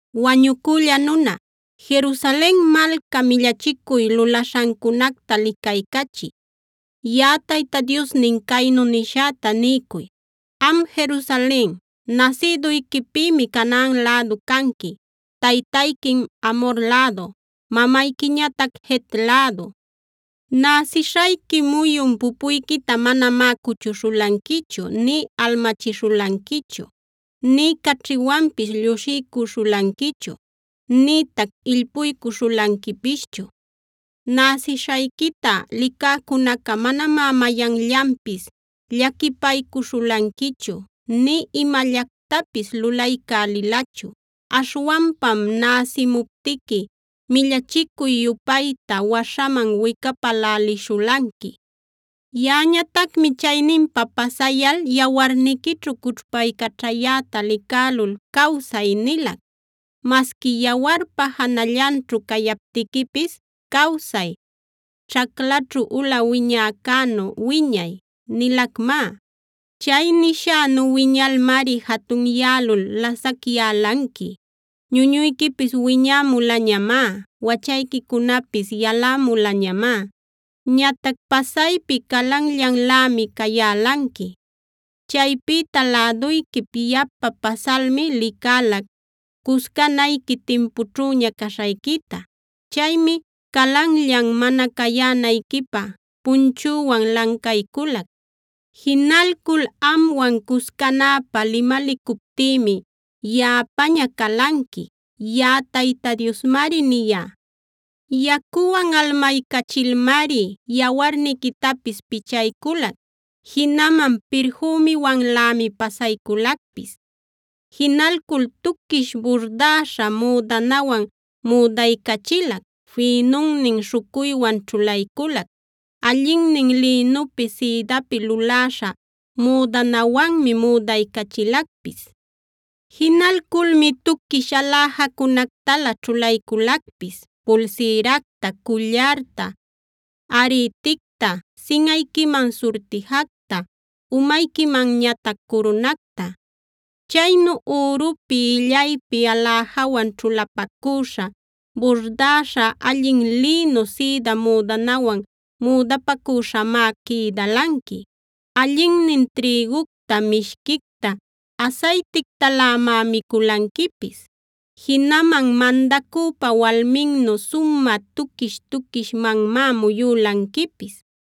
“Wañucülla nuna, Jerusalen malca millachicuy lulaśhancunacta licaycachiy. Yaꞌa Tayta Diosnin caynu nishäta niycuy: ‘Am Jerusalen nasïduyquipïmi Canaan lädu canqui; taytayquim Amhor lädu, mamayquiñatac Het lädu. Näsishayqui muyun pupuyquita manamá cuchuśhulanquichu, nï almachishulanquichu, nï caćhiwanpis llushiycuśhulanquichu, nïtac illpuycuśhulanquipischu. Näsishayquita licäcunaca manamá mayanllanpis llaquipaycuśhulanquichu nï imallactapis lulaycälilachu. Aśhwanpam näsimuptiqui millachicuy-yupayta waśhaman wicapälälishulanqui. “ ‘Yaꞌañatacmi chayninpa pasayal yawarniquićhu cućhpaycaćhayäta licälul “Cawsay” nilac. Masqui yawarpa janallanćhu cayaptiquipis “Cawsay; ćhaclaćhu ula wiñäcänu wiñay” nilacmá. Chay nishänu wiñalmari jatunyälul lasacyälanqui. Ñunuyquipis wiñämulañamá; wachayquicunapis yalämulañamá. Ñatac pasaypi calanllanlämi cayälanqui. “ ‘Chaypïta läduyquip yapa pasalmi licälac, cuscanayqui timpućhüña caśhayquita. Chaymi calanllan mana cayänayquipä punchüwan lancayculac. Jinalcul amwan cuscanapä limalicuptïmi yaꞌapäña calanqui.a Yaꞌa Tayta Diosmari niyá. “ ‘Yacuwan almaycachilmari yawarniquitapis pichayculac. Jinaman pirfümiwanlämi pasayculacpis. Jinalcul tuquish burdäśha müdanawan müdaycachilac, fïnunnin śhucuywan ćhulayculac, allinnin lïnupi sïdapi luläśha müdanawanmi müdaycachilacpis. Jinalculmi tuquish aläjacunactalä ćhulayculacpis: pulsïracta, cullarta, arïticta, sinꞌayquiman surtijacta, umayquimanñatac curunacta. Chaynu ürupi, illaypi aläjawan ćhulapacüśha, burdäśha allin lïnu sïda müdanawan müdapacüśhamá quïdälanqui. Allinnin trïgucta, mishquicta, asaytictalämá miculanquipis. Jinaman mandacüpa walminnu sumä tuquish-tuquishmanmá muyülanquipis.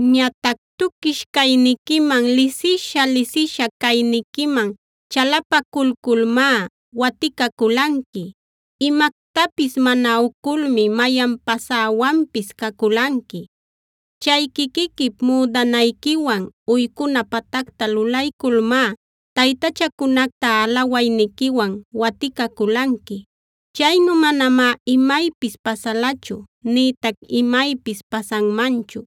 “ ‘Ñatac tuquish cayniquiman, lisisha-lisisha cayniquiman chalapaculculmá waticaculanqui. Imactapis mana uculmi mayan pasäwanpis caculanqui. Chay quiquiquip müdanayquiwan uycuna patacta lulayculmá taytachacunacta alawayniquiwan waticaculanqui. Chaynu manamá imaypis pasalachu nïtac imaypis pasanmanchu.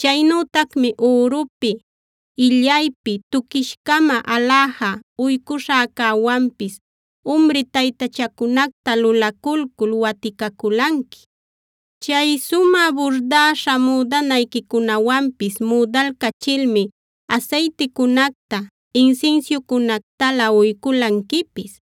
Chaynütacmi ürupi, illaypi tuquish-cama aläja uycuśhäcäwanpis umri taytachacunacta lulaculcul waticaculanqui. Chay sumä burdäśha müdanayquicunawanpis müdalcachilmi asayticunacta, insinsiucunactalä uyculanquipis.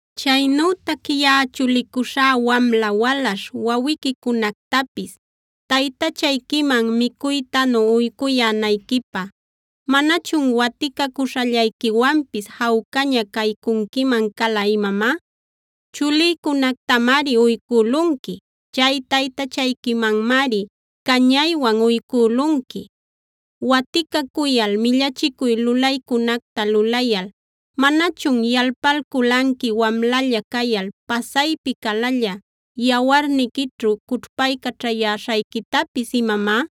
“ ‘Chaynütac yaꞌa chulicuśhá wamla walaśh wawiquicunactapis taytachayquiman micuytanu uycuyänayquipä, ¿manachun waticacuśhallayquiwanpis jawcaña caycunquiman cala imamá? Chulïcunactamari uycülunqui. Chay taytachayquimanmari cañaywan uycülunqui. Waticacuyal, millachicuy lulaycunacta lulayal, ¿manachun yalpalculanqui wamlalla cayal pasaypi calalla, yawarniquićhu cućhpaycaćhayäśhayquitapis imamá?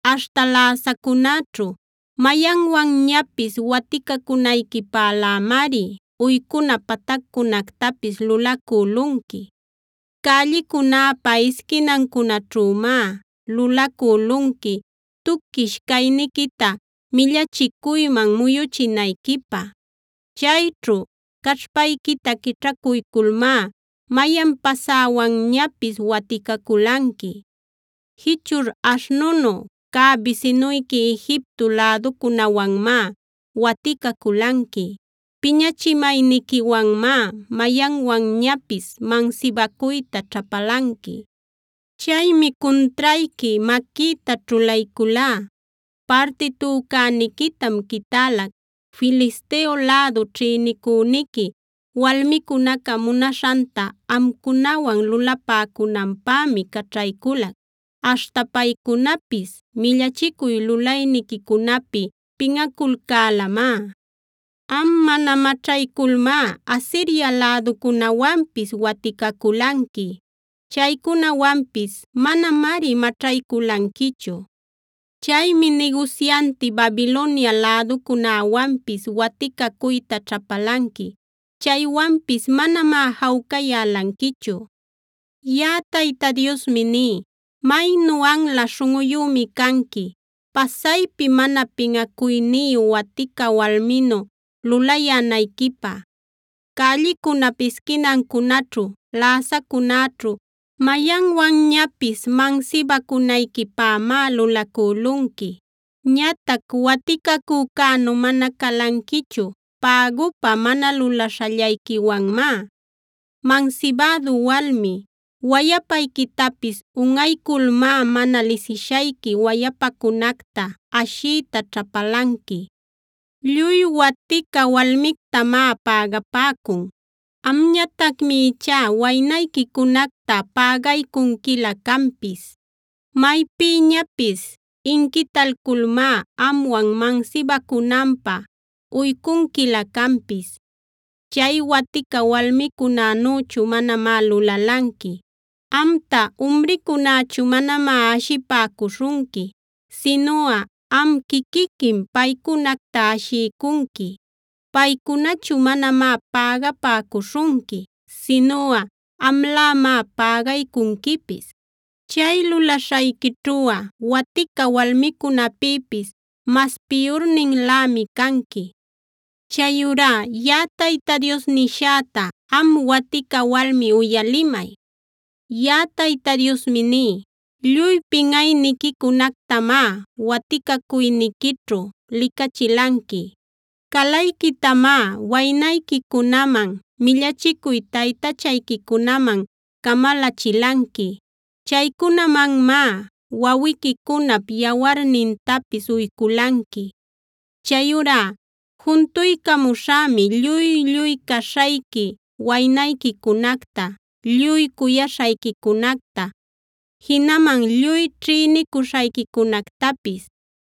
Aśhta läsacunäćhu mayanwanñapis waticacunayquipälämari uycuna pataccunactapis lulacülunqui. Cällicunäpa isquinancunaćhümá lulacülunqui tuquish cayniquita millachicuyman muyuchinayquipä. Chayćhu caćhpayquita quićhacuyculmá mayan pasäwanñapis waticaculanqui. Jichur aśhnunu cä bisinuyqui Egipto läducunäwanmá waticaculanqui. Piñachimayniquiwanmá mayanwanñapis mansibacuyta ćhapalanqui. Chaymi cuntrayqui maquïta ćhulayculá; parti tücäniquitam quitälac. Filisteo lädu ćhïnicüniqui walmicunaca munaśhanta amcunawan lulapäcunanpämi caćhaycülac. Aśhta paycunapis millachicuy lulayniquicunapi pinꞌaculcälamá. Am, mana maćhayculmá Asiria läducunäwanpis waticaculanqui. Chaycunawanpis manamari maćhayculanquichu. Chaymi nigusyanti Babilonia läducunäwanpis waticacuyta ćhapalanqui. Chaywanpis manamá jawcayälanquichu. “ ‘Yaꞌa Tayta Diosmi ní: Maynu anla śhunꞌuyümi canqui, pasaypi mana pinꞌacuyniyu watica walminu lulayänayquipä. Cällicunap isquinancunaćhu, läsacunäćhu mayanwanñapis mansibacunayquipämá lulacülunqui. Ñatac waticacücänu mana calanquichu, pägupä mana lulaśhallayquiwanmá. Mansibädu walmi, wayapayquitapis unꞌayculmá mana lisishayqui wayapacunacta ashiyta ćhapalanqui. Lluy watica walmictamá pägapäcun. Amñatacmi ichá waynayquicunacta pägaycunquilä canpis. Maypïñapis inquitalculmá amwan mansibacunanpä uycunquilä canpis. Chay watica walmicunänüchu manamá lulalanqui. Amta umricunächu manamá ashipäcuśhunqui, sinuꞌa am quiquiquim paycunacta ashiycunqui. Paycunachu manamá pägapäcuśhunqui, sinuꞌa amlämá pägaycunquipis. Chay lulaśhayquićhuꞌa watica walmicunäpïpis mas piyurninlämi canqui. “ ‘Chayurá yaꞌa Tayta Dios niśhäta, am watica walmi uyalimay. Yaꞌa Tayta Diosmi ní: Lluy pinꞌayniquicunactamá waticacuyniquićhu licachilanqui. Calayquitamá waynayquicunaman, millachicuy taytachayquicunaman camalachilanqui. Chaycunamanmá wawiquicunap yawarnintapis uyculanqui. Chayurá juntuycamuśhämi lluy-lluy caśhayqui waynayquicunacta, lluy cuyaśhayquicunacta, jinaman lluy ćhïnicuśhayquicunactapis.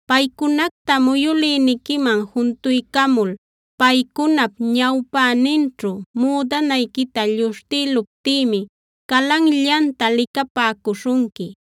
Paycunacta muyülïniquiman juntuycamul paycunap ñawpäninćhu müdanayquita lluśhtïluptïmi calanllacta licapäcuśhunqui.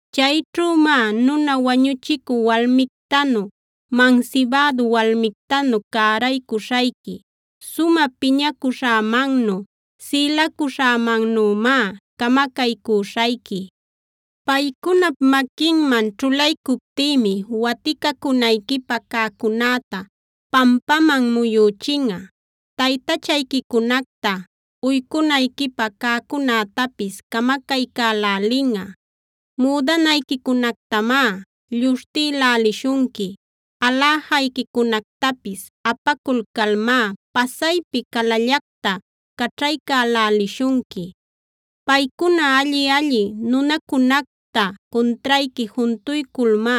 Chayćhümá nuna wañuchicü walmictanu, mansibädu walmictanu cäraycuśhayqui. Sumä piñacuśhämannu, sïlacuśhämannümá camacaycüśhayqui. Paycunap maquinman ćhulaycuptïmi waticacunayquipä cäcunäta pampaman muyüchinꞌa; taytachayquicunacta uycunayquipä cäcunätapis camacaycälälinꞌa. Müdanayquicunactamá lluśhtïlälishunqui; aläjayquicunactapis apaculcalmá pasaypi calallacta caćhaycälälishunqui. Paycuna alli-alli nunacunacta cuntrayqui juntuyculmá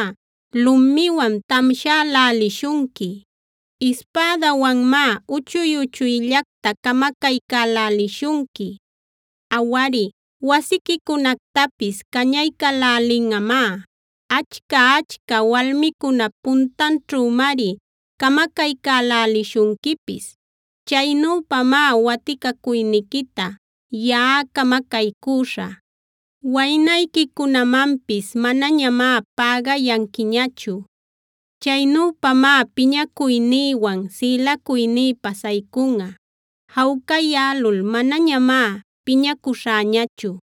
lumiwan tamshälälishunqui; ispädawanmá uchuy-uchuyllacta camacaycälälishunqui. Awari, wasiquicunactapis cañaycälälinꞌamá, achca-achca walmicunap puntanćhümari camacaycälälishunquipis. Chaynüpamá waticacuyniquita yaꞌa camacaycüśhä; waynayquicunamanpis manañamá pägayanquiñachu. Chaynüpamá piñacuynïwan sïlacuyní pasaycunꞌa. Jawcayälul manañamá piñacuśhäñachu.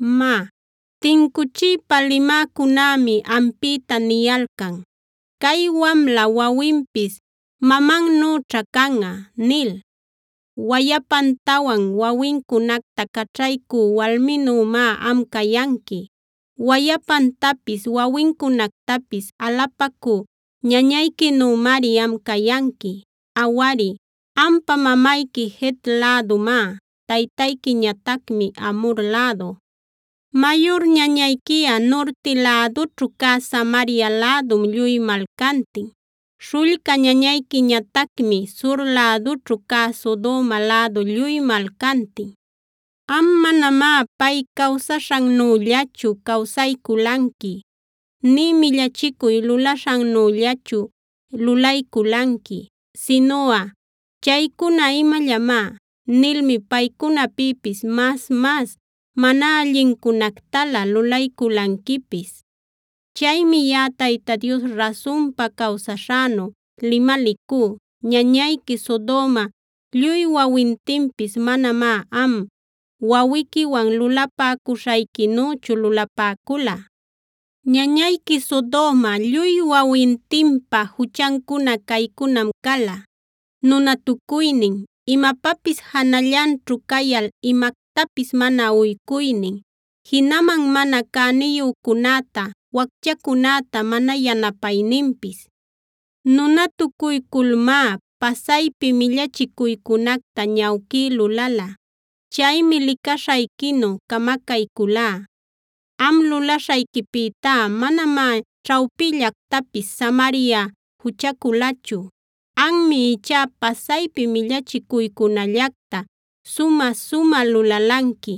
“ ‘Má, tincuchiypa limäcunämi ampïta niyalcan “Cay wamla wawinpis mamannüćhá canꞌa” nil. Wayapantawan wawincunacta caćhaycü walminümá am cayanqui; wayapantapis wawincunactapis alapacü ñañayquinümari am cayanqui. Awari, ampa mamayqui Het lädumá, taytayquiñatacmi Amhor lädu. Mayur ñañayquiꞌa nurti lädućhu cä Samaria lädum lluy malcantin. Śhullca ñañayquiñatacmi sur lädućhu cä Sodoma lädu lluy malcantin. Am manamá pay cawsaśhannüllachu cawsayculanqui, nï millachicuy lulaśhannüllachu lulayculanqui, sinuꞌa “chaycuna imallamá” nilmi paycunapïpis mas-mas mana allincunactalä lulayculanquipis. Chaymi yaꞌa Tayta Dios rasunpa cawsaśhänu limalicú: Ñañayqui Sodoma lluy wawintinpis manamá am, wawiquiwan lulapäcuśhayquinüchu lulapäcula. Ñañayqui Sodoma lluy wawintinpa juchancuna caycunam cala: nunatucuynin, imapapis janallanćhu cayal imactapis mana ucuynin, jinaman mana cäniyücunäta, wacchacunäta mana yanapayninpis. Nunatucuyculmá pasaypi millachicuycunacta ñawquí lulala. Chaymi licaśhayquinu camacaycülá. Am lulaśhayquipïtá manamá ćhawpillactapis Samaria juchaculachu. Anmi ichá pasaypi millachicuycunallacta sumä-sumä lulalanqui.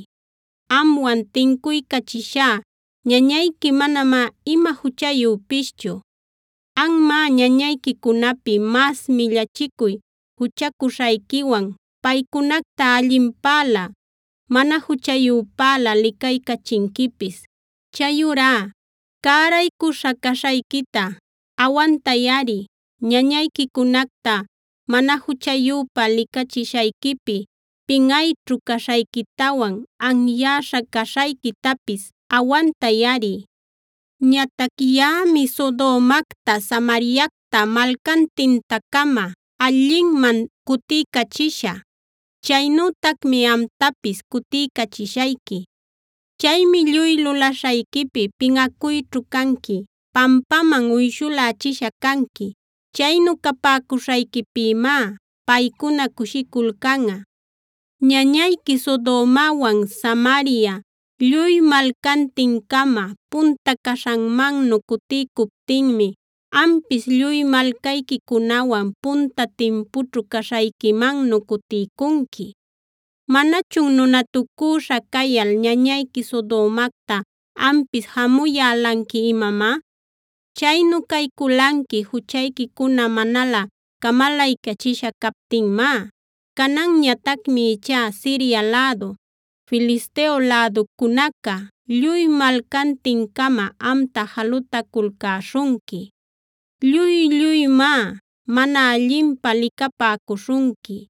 Amwan tincuycachishá ñañayqui manamá ima juchayüpischu. Anmá ñañayquicunapi mas millachicuy juchacuśhayquiwan paycunacta allinpälä, mana juchayüpälä licaycachinquipis. Chayurá cäraycuśha caśhayquita awantayꞌari; ñañayquicunacta mana juchayüpä licachishayquipi pinꞌayćhu caśhayquitawan anyäśha caśhayquitapis awantayꞌari. “ ‘Ñatac yaꞌami Sodomacta, Samariacta malcantinta-cama allinman cutiycachishä. Chaynütacmi amtapis cutiycachishayqui. Chaymi lluy lulaśhayquipi pinꞌacuyćhu canqui; pampaman uyshulächisha canqui. Chaynu capäcuśhayquipïmá paycuna cushiculcanꞌa. Ñañayqui Sodomawan Samaria lluy malcantin-cama punta caśhanmannu cutiycuptinmi ampis lluy malcayquicunawan punta timpućhu caśhayquimannu cutiycunqui. ¿Manachun nunatucüśha cayal ñañayqui Sodomacta ampis jamuyälanqui imamá? Chaynu cayculanqui juchayquicuna manalä camalaycachisha captinmá. Cananñatacmi ichá Siria lädu, Filisteo läducunaca lluy malcantin-cama amta jalutaculcäśhunqui. Lluy-lluymá mana allinpä licapäcuśhunqui.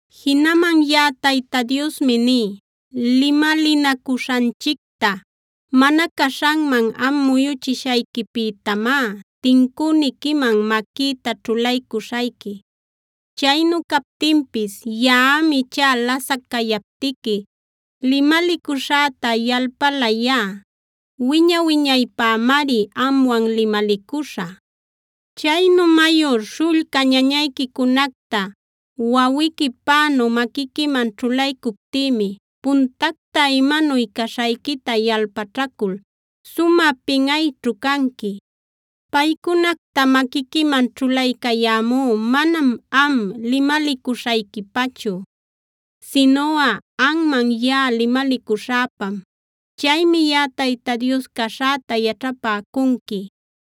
“ ‘Jinaman yaꞌa Tayta Diosmi ní: Limalinacuśhanchicta mana caśhanman am muyuchishayquipïtamá, tincüniquiman maquïta ćhulaycuśhayqui. Chaynu captinpis yaꞌam ichá lasac cayaptiqui limalicuśhäta yalpalayá; wiña-wiñaypämari amwan limalicuśhä. Chaynu mayur, śhullca ñañayquicunacta wawiquipänu maquiquiman ćhulaycuptïmi puntacta imanuy caśhayquita yalpaćhacul sumä pinꞌayćhu canqui. Paycunacta maquiquiman ćhulaycayämú manam am limalicuśhayquipachu, sinuꞌa anman yaꞌa limalicuśhäpam. Chaymi yaꞌa Tayta Dios caśhäta yaćhapäcunqui.